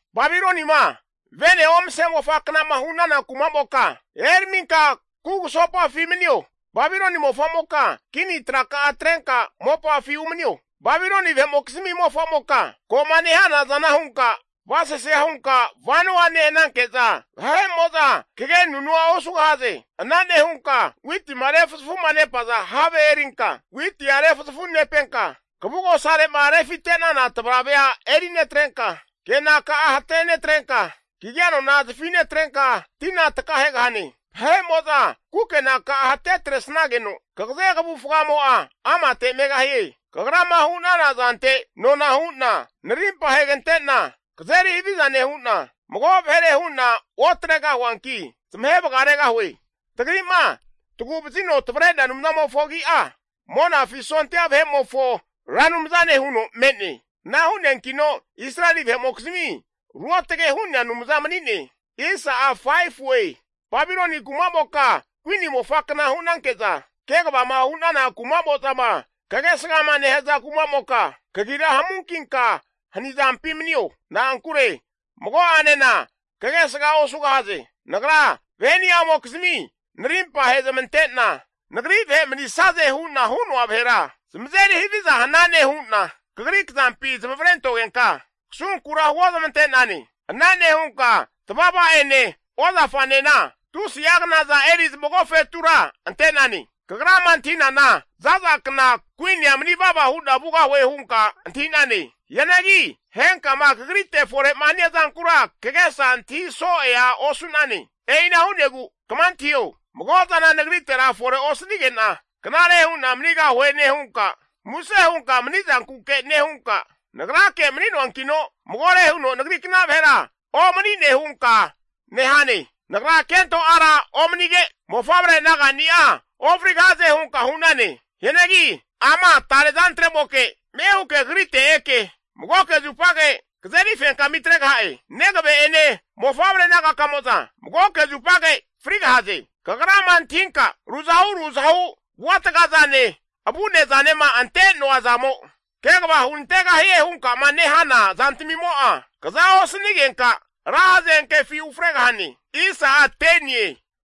Babiloni kumamoka vene omase mofaknama hu'nana kumamoka eraminka kugusopafi manio. Babiloni mofamoka kini traka'a atrenka mopafi umanio, Babiloni vahe'mokizmi mofamoka ko'ma nehana zana hunka kavasasea hunka vanoa nehananke'za vahe'mo'za kagenunua osugahaze. Ana nehunka witima refuzafuma nepaza have erinka witia refuzafu nepenka, kavugosare'ma rufite'nana tavaravea eri netrenka, kenaka'a hatenetrenka, kagia anona zafi netrenka tina takahegahane. Vahe'moza kukenaka'a hate atresnageno kagaze kavufgamo'a amate megahie. Kagrama hu'nana zante nona hu'na narimpa ahegante'na kazeri haviza nehu'na, mago vahere hu'na otregahuankina zamahe vagaregahue. Tagri'ma Tagu'vazino tavre'nea Anumzamofo agi'a, Monafi sondia vahe'mofo Ra Anumzane huno me'ne. Ana hu'neankino Israeli vahe'mokizmi Ruotage hu'nea Anumza mani'ne. Babiloni kumamoka kuini mofaknama hunanke'za, kegavama hunana kumamo'zama kagesgama nehaza kumamoka kagira hamunkinka hani zampi manio. Na'ankure mago'anena kagesga osugahaze. Nagra vaheni'amokizmi narimpa ahezamante'na, Nagri vahe manisaze hu'na hu'noa vahera zamazeri haviza hanane huna kagri kazampi zamavare antogenka, kasunkura huozmante'nane. Ana nehunka tavavaneramine ozafaraminena tusi'a knaza eri zamagofetura ante'nane. Kagrama antahinana zaza kna kuinia mani vava hu'na vugahue hunka antahi'nane. Hianagi henkama kagrite fore'ma hania zankura kagesa antahi so'ea osu'nane. E'ina hu'negu kama antahio, mago zana nagritera fore osanigena knare hu'na manigahue nehunka, muse hunka manizankuke nehunka, nagrake mani'noankino magore huno nagrikna vahera omanine hunka nehane. Nagra kento ara omanige, mofavre nagani'a ofrigahaze hunka hu'nane. Hianagi ama tare zantre'moke ame huke kagrite eke magoke zupage kazeri fenkami atregaha'e. Negave'ene mofavre nagakamo'za magoke zupage frigahaze. Kagrama antahinka ruzahu ruzahu avua tagazane avune zanema ante'noa zamo kegava hunantegahie hunka'ma nehana zantamimo'a, kza osanigenka ra hazenkefi ufregahane.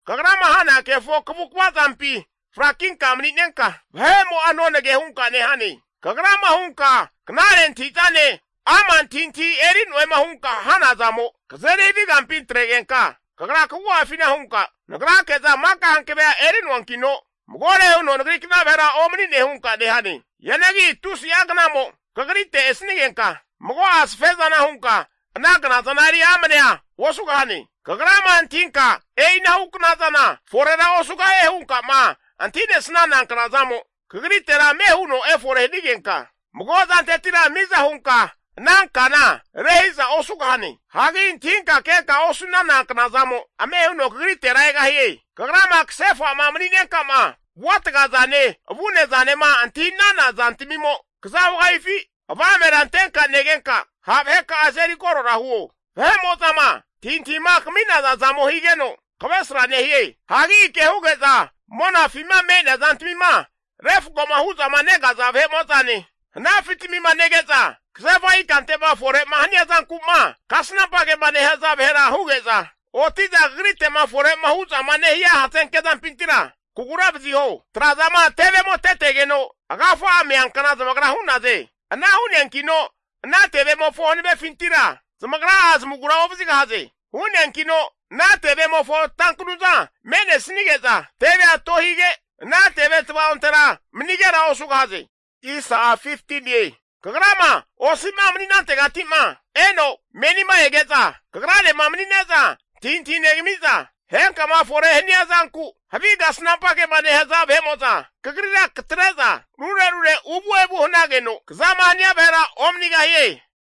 Kagrama hana kefo kavukva zampi frakinka mani'nenka, vahe'mo'a nonage hunka nehane. Kagrama hunka knare antahi'zane ama' antahintahi eri'noema hunka hanazamo, kazeri havi kampina atregenka, kagra kagu'afina hunka nagrake'za maka hankavea eri'noankino magore huno nagrikna vahera omani'ne hunka nehane. Hianagi tusi'a knamo kagrite esanigenka, mago'a safezana hunka ana knazana eri amnea osugahane. Kagrama antahinka e'inahu knazana forera osugahie hunkama antahi'nesnana knazamo, kagritera ame huno efore hanigenka mago zantetira miza hunka ana kana rehizara osugahane. Hagi antahinka kenka osu'nana knazamo, ame huno kagritera egahie. Kagrama kasefa'ma mani'nenka'ma avuataga zane avunezanema antahi'nana zantamimo kaza hugahifi, avamera antenka negenka ha' vaheka'a azeri korora huo. Vahe'mozama antahintahima kami'naza zamo higeno kavesra nehie. Hagi ke huge'za monafima me'nea zantamima refkoma hu'zama negaza vahe'mo'zane, hanafitamima nege'za kasefa ikante'ma fore'ma hania zanku'ma kasnampa kema nehaza vahera huge'za, oti'za kagrite'ma fore'ma hu'zama nehia hazenke zampintira kagura vaziho. Trazama tevemo tetegeno agafa'a meankna zamagra hu'naze. Ana hu'neankino ana tevemofo hanavefintira zamagra'a zamagura ovazigahaze. Hu'neankino ana tevemofo tankanuza me'nesige'za tevea tohige ana teve tavaontera manigera osugahaze. Kagrama osi'ma mani'nantegati'ma eno menima ege'za kagranema mani'neza antahintahi negami'za, henkama fore hania zanku havi kasnampa kema nehaza vahe'mo'za kagrira katre'za rure rure uvu evu hanageno kazama hania vahera omanigahie.